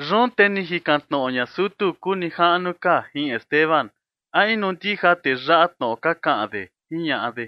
Yun te ni jikan tnoꞌo ña sutu kuu nijaꞌnu ka jin Esteban: ―¿A inu ndija tee yaꞌa tnoꞌo ka kaꞌan de? ―jiñaꞌa de.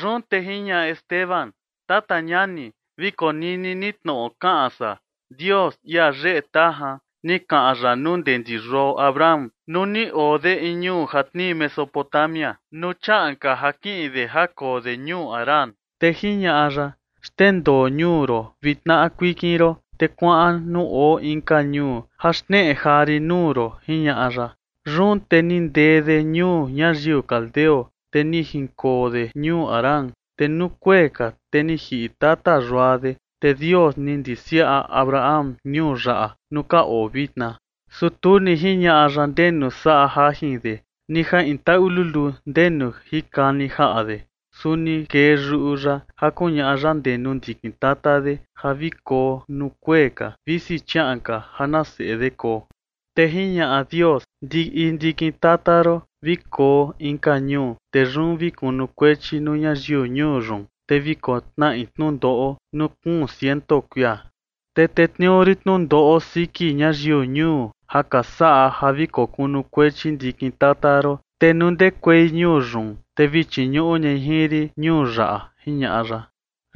Yun te jiñaꞌa Esteban: ―Tata ñani, vi konini ni tnoꞌo kaꞌan san. Dios, ia yeꞌe tajan, ni kaꞌan ya nuu ndee ndi yuao Abraham nuu ni oo de in ñuu ja tnii Mesopotamia, nuu chiaꞌan ka ja kiꞌin de ja koo de ñuu Harán, te jiñaꞌa ya: “Xndendoo ñuu ron vi tnaꞌa kuikin ron, te kuaꞌan nuu oo inka ñuu ja xneꞌe jaa rin nuu ron”, jiñaꞌa ya. Yun te ni ndee de ñuu ñayiu caldeo, te ni jinkoo de ñuu Harán. Te nuu kuee ka, te ni jiꞌi tata yua de, te Dios ni ndisiaꞌa Abraham ñuu yaꞌa nuu ka oo vitna. Su tu ni jiñaꞌa ya ndenu saꞌa jajin de ni ja in taꞌu luluu ndenu jinkani jaꞌa de. Su ni kee yuꞌu ya ja kuñaꞌa ya ndee nuu ndiꞌi ndikin tata de ja vi koo nuu kuee ka, visi chiaꞌan ka ja na seꞌe de koo. Te jiñaꞌa Dios: “Ndiꞌi ndikin tata ron vi koo inka ñuu. Te yun vi kunukuechi nuu ñayiu ñuu yun, te vi kotnaꞌi tnundoꞌo nuu kuun ciento kuia. Te tetniuu rin tnundoꞌo siki ñayiu ñuu ja ka saꞌa ja vi kokunukuechi ndikin tata ron, te nuu ndekuei ñuu yun, te vi chiñuꞌu ñai jin rin ñuu yaꞌa”, jiñaꞌa ya.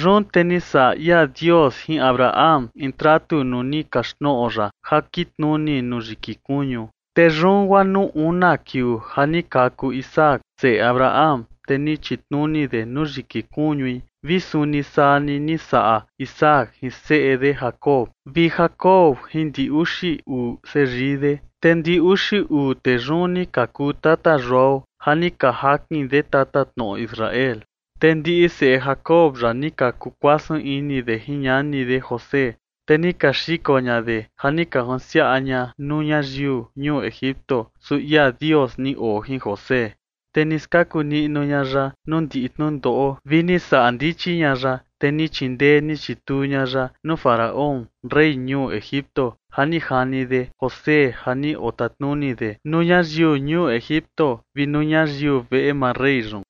Yun te ni saꞌa ia Dios jin Abraham in tratu nuu ni kaxtnoꞌo ya ja kitnuni nuu yiki kuñu. Te yun guaa nuu una kiuu ja ni kaku Isaac, seꞌe Abraham, te ni chitnuni de nuu yiki kuñui vi suni saa ni ni saꞌa Isaac jin seꞌe de Jacob, vi Jacob jin ndi uxi uu seyii de. Te ndi uxi uu tee yun ni ka kuu tata yuao ja ni ka jakin de tatatnoꞌo Israel. ’Te ndiꞌi seꞌe Jacob yaꞌa ni ka kukuasun ini de jin ñani de José, te ni ka xiko ña de ja ni ka junsiaꞌa ña nuu ñayiu ñuu Egipto, su ia Dios ni oo jin José. Te ni skaku niꞌnu ña ya nuu ndiꞌi tnundoꞌo vi ni saꞌa ndichi ña ya, te ni chindee ni chituu ña ya nuu Faraón, rey ñuu Egipto, ja ni jani de José ja ni otatnuni de nuu ñayiu ñuu Egipto vi nuu ñayiu veꞌe maa rey yun.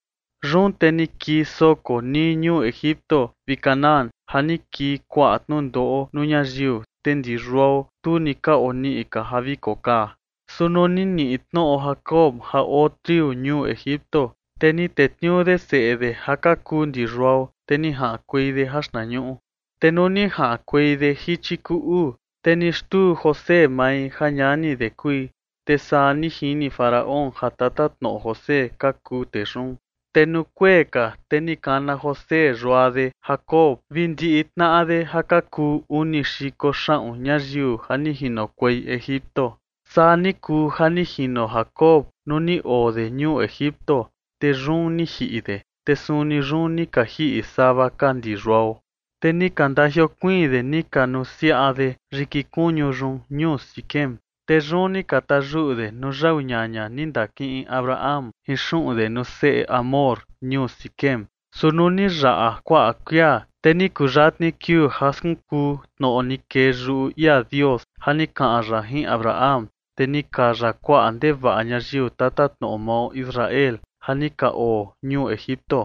’Yun te ni kii soko nii ñuu Egipto vi Canaán ja ni kii kuaꞌa tnundoꞌo nuu ñayiu, te ndi yuao, tu ni ka oniꞌi ka ja vi kokaa. Su nuu ni niꞌi tnoꞌo Jacob ja oo triu ñuu Egipto, te ni tetniuu de seꞌe de ja ka kuu ndi yuao, te ni jaꞌankuei de jaxtnañuꞌu. Te nuu ni jaꞌankuei de jichi kuu uu, te ni xtuu José mai ja ñani de kui, te saa ni jini Faraón ja tatatnoꞌo José ka kuu tee yun. Te nuu kuee ka, te ni kana José yua de Jacob vi ndiꞌi tnaꞌa de ja ka kuu uni xiko xaꞌun ñayiu ja ni jinokuei Egipto. Saa ni kuu ja ni jino Jacob nuu ni oo de ñuu Egipto, te yun ni jiꞌi de. Te suni yun ni ka jiꞌi sava ka ndi yuao. Te ni ka ndajiokuiin de ni ka nusiaꞌa de yiki kuñu yun ñuu Siquem. Te yun ni ka tayuꞌu de nuu yau ñaña ni ndakiꞌin Abraham jin xuꞌun de nuu seꞌe Hamor ñuu Siquem. ’Su nuu ni yaꞌa kuaꞌa kuia, te ni kuyatni kiuu ja skunkuu tnoꞌo ni kee yuꞌu ia Dios ja ni kaꞌan ya jin Abraham, te ni kaya kuaꞌa ndevaꞌa ñayiu tatatnoꞌo mao Israel ja ni ka oo ñuu Egipto,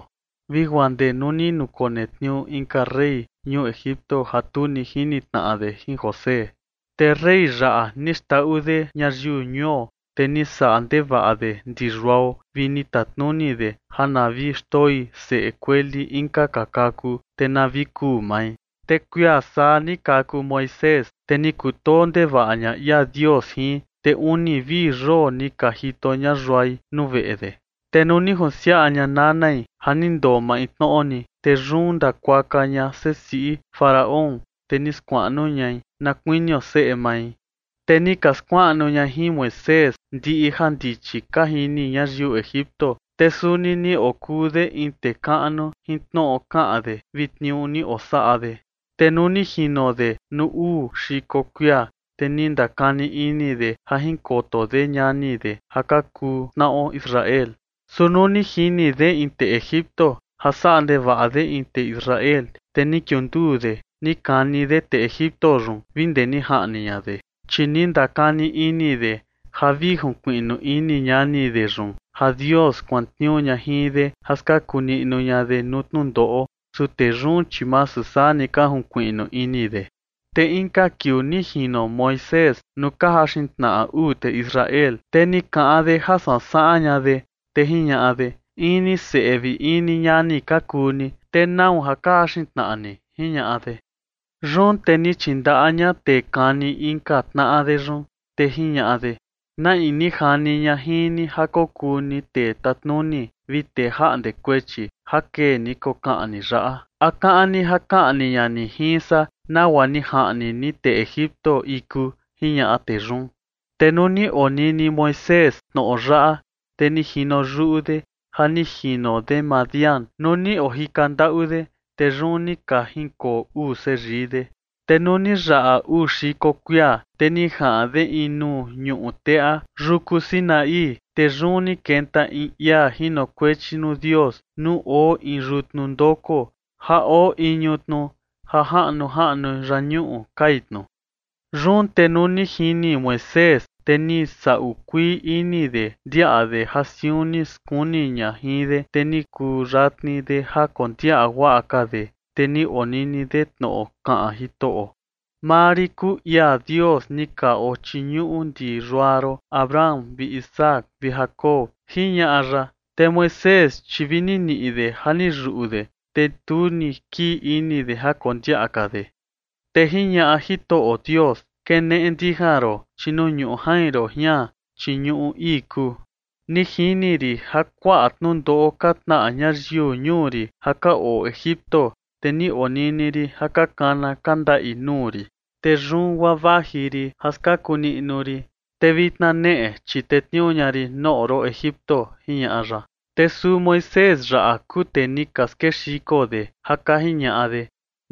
vi guaa ndee nuu ni nukonetniuu inka rey ñuu Egipto ja tu ni jini tnaꞌa de jin José. Te rey yaꞌa ni xndaꞌu de ñayiu ñuo, te ni saꞌa ndevaꞌa de ndi yuao vi ni tatnuni de ja na vi xndoi seꞌe kueli inka ka kaku, te na vi kuu mai. Te kuia saa ni kaku Moisés, te ni kutoo ndevaꞌa ña ia Dios jin, te uni vi yoo ni ka jito ña yuai nuu veꞌe de. Te nuu ni junsiaꞌa ña nanai ja ni ndoo maintnoꞌo ni, te yun ndakuaka ña sesiꞌi Faraón, te ni skuaꞌnu ñai na kuinio seꞌe mai. Te ni ka skuaꞌa ña jin Moisés ndiꞌi jandichi ka jini ñayiu Egipto, te suni ni okuu de in tee kaꞌnu jin tnoꞌo kaꞌan de vi tniuu ni osaꞌa de. ’Te nuu ni jino de nuu uu xiko kuia, te ni ndakani ini de ja jinkoto de ñani de ja ka kuu tnaꞌo Israel. Su nuu ni jini de in tee Egipto ja saꞌa ndevaꞌa de in tee Israel, te ni kiunduu de ni kani de tee Egipto yun vi ndee ni jaꞌni ña de. Chi ni ndakani ini de ja vi junkuiꞌnu ini ñani de yun ja Dios kuantniuu ña jin de ja skaku niꞌnu ña de nuu tnundoꞌo. Su tee yun, chi masu saa ni ka junkuiꞌnu ini de. Te inka kiuu ni jino Moisés nuu ka jaxin tnaꞌa uu tee Israel, te ni kaꞌan de ja sansaꞌan ña de, te jiñaꞌa de: “In ni seꞌe vi in ni ñani ka kuu ni, te ¿nau ja ka jaxin tnaꞌa ni?” jiñaꞌa de. Yun te ni chindaꞌa ña tee kani inka tnaꞌa de yun, te jiñaꞌa de: “¿Na in ni jani ña jin ni ja kokuu ni tee tatnuni vi tee jaꞌnde kuechi ja kee ni kokaꞌan ni yaꞌa? ¿A kaꞌan ni ja kaꞌni ña ni jin san nagua ni jaꞌni ni tee Egipto iku?” jiñaꞌa tee yun. Te nuu ni onini Moisés tnoꞌo yaꞌa, te ni jino yuꞌu de ja ni jino de Madián nuu ni ojika ndaꞌu de. Te yun ni ka jinkoo uu seyii de. ’Te nuu ni yaꞌa uu xiko kuia, te ni jaꞌan de in nuu ñuꞌu teꞌa yuku Sinaí. Te yun ni kenta in ia jinokuechi nuu Dios nuu oo in yutnu ndoko ja oo iñu tnu ja jaꞌnu jaꞌnu yañuꞌu kai tnu. Yun te nuu ni jini Moisés, te vi ni saꞌu kuii ini de ndiaꞌa de ja siun ni skuni ña jin de. Te ni kuyatni de ja kondiaꞌa guaꞌa ka de, te ni onini de tnoꞌo kaꞌan Jitoꞌo: “Maa rin kuu ia Dios ni ka ochiñuꞌu ndi yua ron Abraham vi Isaac vi Jacob”, jiñaꞌa ya. Te Moisés, chi vi ni niꞌi de ja ni yuꞌu de, te tu ni kii ini de ja kondiaꞌa ka de. Te jiñaꞌa Jitoꞌo Dios: “Keneꞌe ndijan ron, chi nuu ñuꞌu jain ron jian, chi ñuꞌu ii kuu. Ni jini rin ja kuaꞌa tnundoꞌo ka tnaꞌa ñayiu ñuu rin ja ka oo Egipto, te ni onini rin ja ka kana ka ndaꞌi nuu rin. Te yun guaa vaji rin ja skaku niꞌnu rin. Te vitna neꞌe, chi tetniuu ña rin noꞌo ron Egipto”, jiñaꞌa ya. ’Te suu Moisés yaꞌa kuu tee ni ka skexiko de ja ka jiñaꞌa de: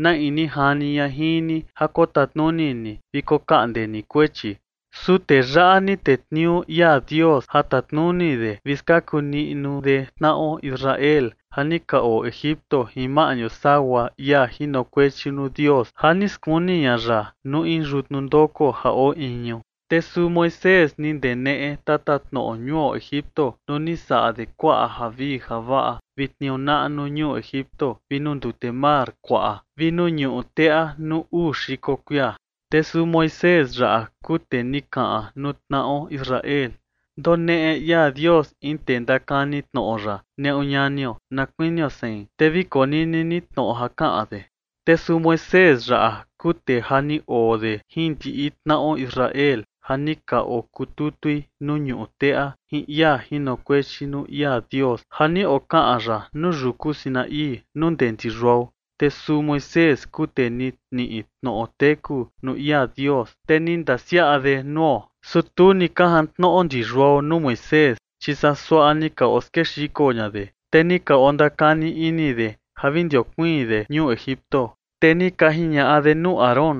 “¿Na in ni jani ña jin ni ja kotatnuni ni vi kokaꞌnde ni kuechi?” Su tee yaꞌa ni tetniuu ia Dios ja tatnuni de vi skaku niꞌnu de tnaꞌo Israel ja ni ka oo Egipto jin maꞌñu sagua ia jinokuechi nuu Dios ja ni skuni ña ya nuu in yutnu ndoko ja oo iñu. Te suu Moisés ni ndeneꞌe tatatnoꞌo ñuu Egipto nuu ni saꞌa de kuaꞌa javii javaꞌa vi tniuu naꞌnu ñuu Egipto vi nuu ndute mar kuaꞌa vi nuu ñuꞌu teꞌa nuu uu xiko kuia. Te suu Moisés yaꞌa kuu tee ni kaꞌan nuu tnaꞌo Israel: “Ndoneꞌe ia Dios in tee ndakani tnoꞌo ya neꞌu ñanio, na kuinio sein, te vi konini ni tnoꞌo ja kaꞌan de”. Te suu Moisés yaꞌa kuu tee ja ni oo de jin ndiꞌi tnaꞌo Israel ja ni ka okututui nuu ñuꞌu teꞌa, jin ia jinokuechi nuu ia Dios ja ni okaꞌan ya nuu yuku Sinaí, nuu ndee ndi yuao. Te suu Moisés kuu tee ni niꞌi tnoꞌo teku nuu ia Dios, te ni ndasiaꞌa de nuo. ’Su tu ni ka jantnoꞌo ndi yuao nuu Moisés, chi saa suaꞌa ni ka oskexiko ña de, te ni ka ondakani ini de ja vi ndajiokuiin de ñuu Egipto. Te ni ka jiñaꞌa de nuu Aarón: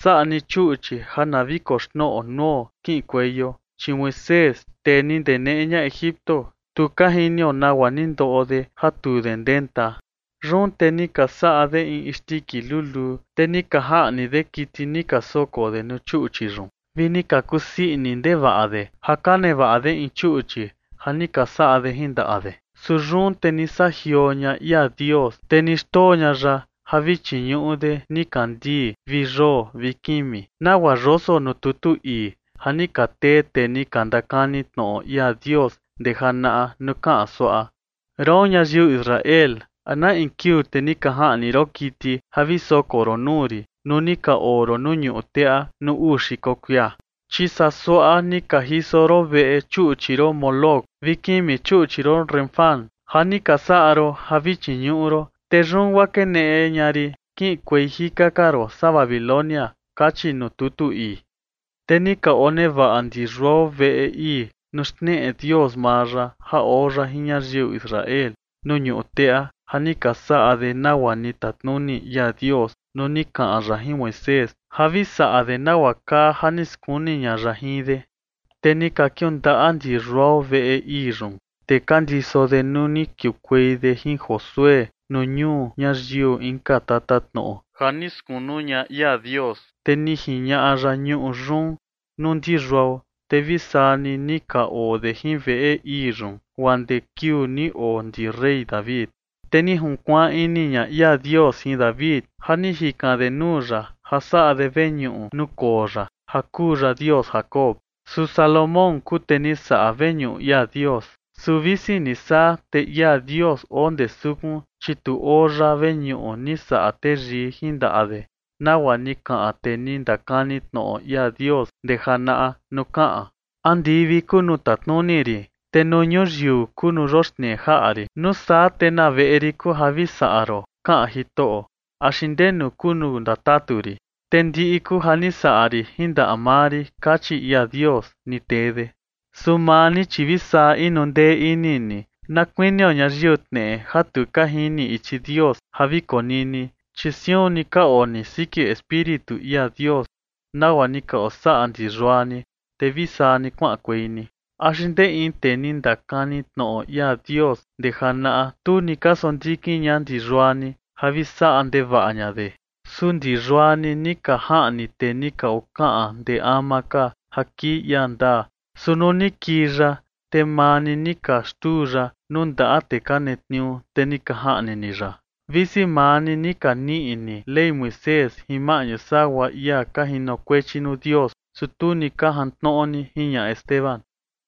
“Saꞌa ni chuꞌchi ja na vi koxnoꞌo nuo kiꞌinkueio, chi Moisés, tee ni ndeneꞌe ña Egipto, tu ka jinio nagua ni ndoꞌo de ja tu de ndenta”. Yun te ni ka saꞌa de in isndiki luluu, te ni ka jaꞌni de kiti ni ka soko de nuu chuꞌchi yun, vi ni ka kusii ini ndevaꞌa de ja ka nevaꞌa de in chuꞌchi ja ni ka saꞌa de jin ndaꞌa de. Su yun te ni saꞌa jioo ña ia Dios, te ni xndoo ña ya ja vi chiñuꞌu de nikandii vi yoo vi kimi, nagua yoso nuu tutu ii ja ni ka tee tee ni ndakani tnoꞌo ia Dios ndee janaꞌa nuu kaꞌan suaꞌa: Roon ñayiu Israel, ¿a na in kiuu te ni ka jaꞌni ron kiti ja vi soko ron nuu rin nuu ni ka oo ron nuu ñuꞌu teꞌa nuu uu xiko kuia? Chi saa suaꞌa ni ka jiso ron veꞌe chuꞌchi ron Moloc, vi kimi chuꞌchi ron Refán, ja ni ka saꞌa ron ja vi chiñuꞌu ron. Te yun guaa keneꞌe ña rin kiꞌinkuei jika ka ron saa Babilonia kachi nuu tutu ii. ’Te ni ka onevaꞌa ndi yuao veꞌe ii nuu xneꞌe Dios maa ya ja oo ya jin ñayiu Israel nuu ñuꞌu teꞌa ja ni ka saꞌa de nagua ni tatnuni ia Dios nuu ni kaꞌan ya jin Moisés ja vi saꞌa de nagua kaa ja ni skuni ña ya jin de. Te ni ka kiundaꞌa ndi yuao veꞌe ii yun, te ka ndiso de nuu ni kiukuei de jin Josué nuu ñuu ñayiu inka tatatnoꞌo ja ni skunu ña ia Dios. Te ni jiñaꞌa ya ñuꞌu yun nuu ndi yuao, te vi saa ni, ni ka oo de jin veꞌe ii yun guaa ndee kiuu ni oo ndi rey David. Te ni junkuaan ini ña ia Dios jin David ja ni jikan de nuu ya ja saꞌa de veñuꞌu nuu koo ya, ja kuu ya Dios Jacob. Su Salomón kuu tee ni saꞌa veñuꞌu ia Dios. Su visi ni saa, te ia Dios oo ndee sukun, chi tu oo ya veñuꞌu ni saꞌa teyii jin ndaꞌa de, nagua ni kaꞌan tee ni ndakani tnoꞌo ia Dios ndee janaꞌa nuu kaꞌan: Andivi kuu nuu tatnuni rin te nuu ñuyiu kuu nuu yoxnee jaꞌa rin. ¿Nuu saa te na veꞌe rin kuu ja vi saꞌa ron? kaꞌan Jitoꞌo. ¿Axi ndenu kuu nuu ndatatu rin? Te ndiꞌi kuu ja ni saꞌa rin jin ndaꞌa maa rin, kachi ia Dios ni tee de. ’Su maa ni, chi vi saa inu ndee ini ni, na kuinio ñayiu tneꞌe ja tu ka jini ichi Dios ja vi konini, chi siun ni ka oo ni siki Espíritu ia Dios, nagua ni ka osaꞌa ndi yua ni, te vi saa ni kuaꞌankuei ni. ¿Axi ndee in tee ni ndakani tnoꞌo ia Dios ndee janaꞌa, tu ni ka sondikin ña ndi yua ni ja vi saꞌa ndevaꞌa ña de? Su ndi yua ni ni ka jaꞌni tee ni ka okaꞌan ndee ama ka ja kii ia ndaa. Su nuu ni kii ya, te maa ni ni ka xtuu ya nuu ndaꞌa tee ka netniuu, te ni ka jaꞌni ni ya. Visi maa ni ni ka niꞌi ni Ley Moisés jin maꞌñu sagua ia ka jinokuechi nuu Dios, su tu ni ka jantnoꞌo ni ―jiñaꞌa Esteban.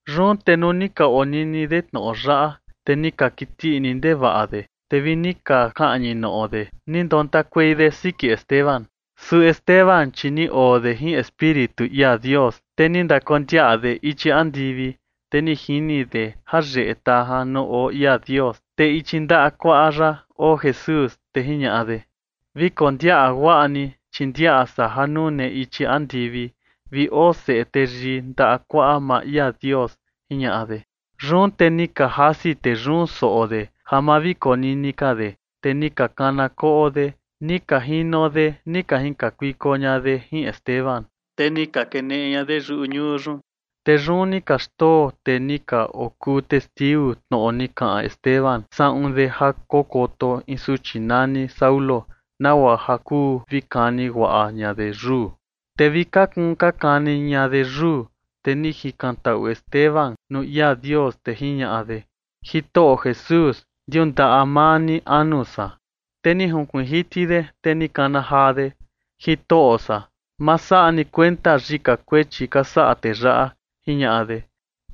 Yun te nuu ni ka onini de tnoꞌo yaꞌa, te ni ka kiti ini ndevaꞌa de, te vi ni ka kaꞌñi noꞌo de ni ndontakuei de siki Esteban. Su Esteban, chi ni oo de jin Espíritu ia Dios, te ni ndakondiaꞌa de ichi andivi, te ni jini de ja yeꞌe tajan nuu oo ia Dios, te ichi ndaꞌa kuaꞌa ya oo Jesús. Te jiñaꞌa de: ―Vi kondiaꞌa guaꞌa ni, chi ndiaꞌa san ja nune ichi andivi vi oo Seꞌe Teyii ndaꞌa kuaꞌa maa ia Dios ―jiñaꞌa de. Yun te ni ka jasi tee yun soꞌo de ja ma vi konini ka de, te ni ka kana koꞌo de ni ka jino de ni ka jinkakuiko ña de jin Esteban. Te ni ka keneꞌe ña de yuꞌu ñuu yun, te yun ni ka xndoo tee ni ka okuu testiu tnoꞌo ni kaꞌan Esteban saꞌun de ja kokoto in suchi nani Saulo, nagua ja kuu vi kani guaꞌa ña de yuu. Te vi ka kuun ka kani ña de yuu, te ni jikantaꞌu Esteban nuu ia Dios, te jiñaꞌa de: ―Jitoꞌo Jesús, ndiundaꞌa maa ni anu san. Te ni junkuiin jiti de, te ni kana jaa de: ―Jitoꞌo san, ma saꞌa ni kuenta yika kuechi ka saꞌa tee yaꞌa ―jiñaꞌa de.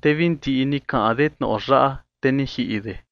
Te vi ndiꞌi ni kaꞌan de tnoꞌo yaꞌa, te ni jiꞌi de.